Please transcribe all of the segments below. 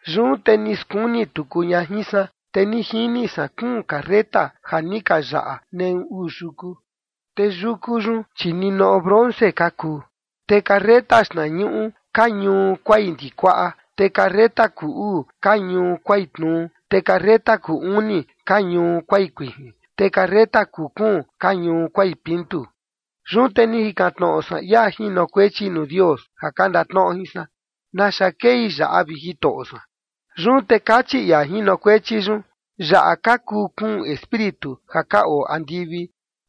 Yun te ni skuni tuku ña jin san, te ni jini san kuun carreta ja ni ka yaꞌa neꞌu uu yuku. Te yuku yun, chi ninoꞌo bronce ka kuu. Te carreta xtnañuꞌu ka ñuu kuai ndikuaꞌa, te carreta kuu uu ka ñuu kuai tnuu. Te carreta kuu uni ka ñuu kuai kuijin, te carreta kuu kuun ka ñuu kuai pintu. Yun te ni jikan tnoꞌo san ia jinokuechi nuu Dios ja ka ndatnoꞌo jin san: “¿Naxa kei yaꞌa, vi Jitoꞌo san?” Yun te kachi ia jinokuechi yun: “Yaꞌa ka kuu kuun espíritu ja ka oo andivi,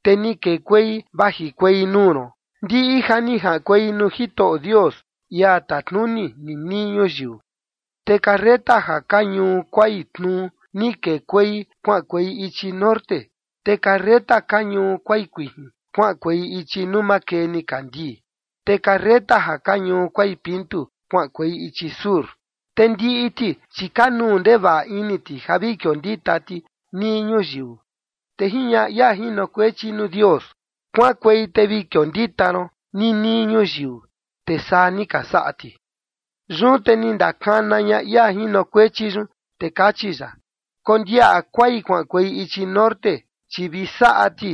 te ni kekuei vajikuei nuu ron ndiꞌi ja ni jaꞌankuei nuu Jitoꞌo Dios, ia tatnuni ninii ñuyiu. Te carreta ja ka ñuu kuai tnuu ni kekuei kuaꞌankuei ichi norte, te carreta ka ñuu kuai kuijin kuaꞌankuei ichi nuu makee nikandii, te carreta ja ka ñuu kuai pintu kuaꞌankuei ichi sur”. Te ndiꞌi ti, chi kanuu ndevaꞌa ini ti ja vi kiondita ti nii ñuyiu. Te jiñaꞌa ia jinokuechi nuu Dios: “Kuaꞌankuei te vi kiondita ron ninii ñuyiu”. Te saa ni ka saꞌa ti. Yun te ni ndakana ña ia jinokuechi yun, te kachi ya: “Kondiaꞌa kuai kuaꞌankuei ichi norte, chi vi saꞌa ti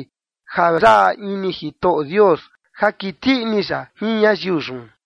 ja yaꞌa ini Jitoꞌo Dios ja kiti ini ya jin ñayiu yun”.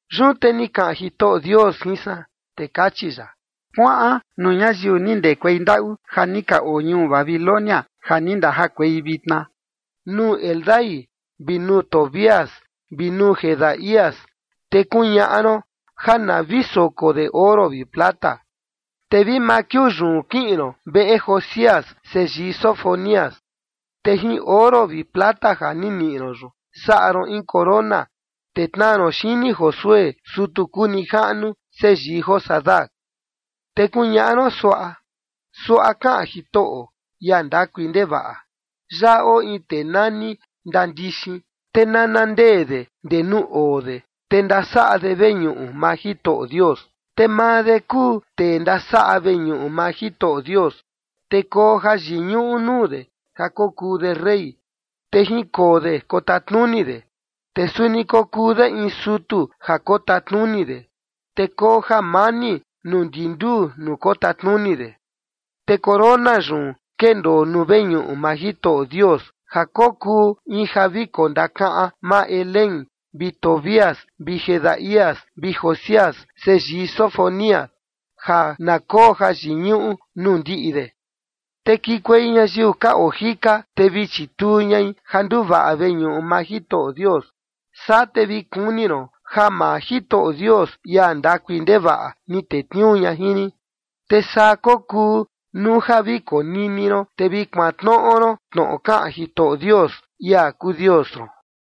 Yun te ni kaꞌan Jitoꞌo Dios jin san, te kachi ya: “Kuaꞌan nuu ñayiu ni ndekuei ndaꞌu ja ni ka oo ñuu Babilonia, ja ni ndajakuei vitna, nuu Heldai vi nuu Tobías vi nuu Jedaías, te kuñaꞌa ron ja na vi soko de oro vi plata. Te vi maa kiuu yun kiꞌin ron veꞌe Josías, seyii Sofonías. Te jin oro vi plata ja ni niꞌi ron yun, saꞌa ron in corona, te tnaa ron xini Josué, sutu kuu nijaꞌnu seyii Josadac. Te kuñaꞌa ron suaꞌa: Suaꞌa kaꞌan Jitoꞌo, ia ndakui ndevaꞌa: Yaꞌa oo in tee nani ndandixin, te nana ndee de ndee nuu oo de, te ndasaꞌa de veñuꞌu maa Jitoꞌo Dios. Te maa de kuu tee ndasaꞌa veñuꞌu maa Jitoꞌo Dios, te koo jayiñuꞌu nuu de ja kokuu de rey, te jinkoo de kotatnuni de, te suni kokuu de in sutu ja kotatnuni de, te koo jamani nuu ndi nduu nuu kotatnuni de. Te corona yun kendoo nuu veñuꞌu maa Jitoꞌo Dios, ja kokuu in ja vi kondakaꞌan maa Helem, vi Tobías vi Jedaías, vi Josías, seyii Sofonías, ja na koo jayiñuꞌu nuu ndiꞌi de. Te kikuei ñayiu ka oo jika, te vi chituu ñai ja nduvaꞌa veñuꞌu maa Jitoꞌo Dios. Saa te vi kuni ron ja maa Jitoꞌo Dios, ia ndakui ndevaꞌa, ni tetniuu ña jin rin. Te saa kokuu nuu ja vi konini ron, te vi kuantnoꞌo ron tnoꞌo kaꞌan Jitoꞌo Dios, ia kuu Dios ron.”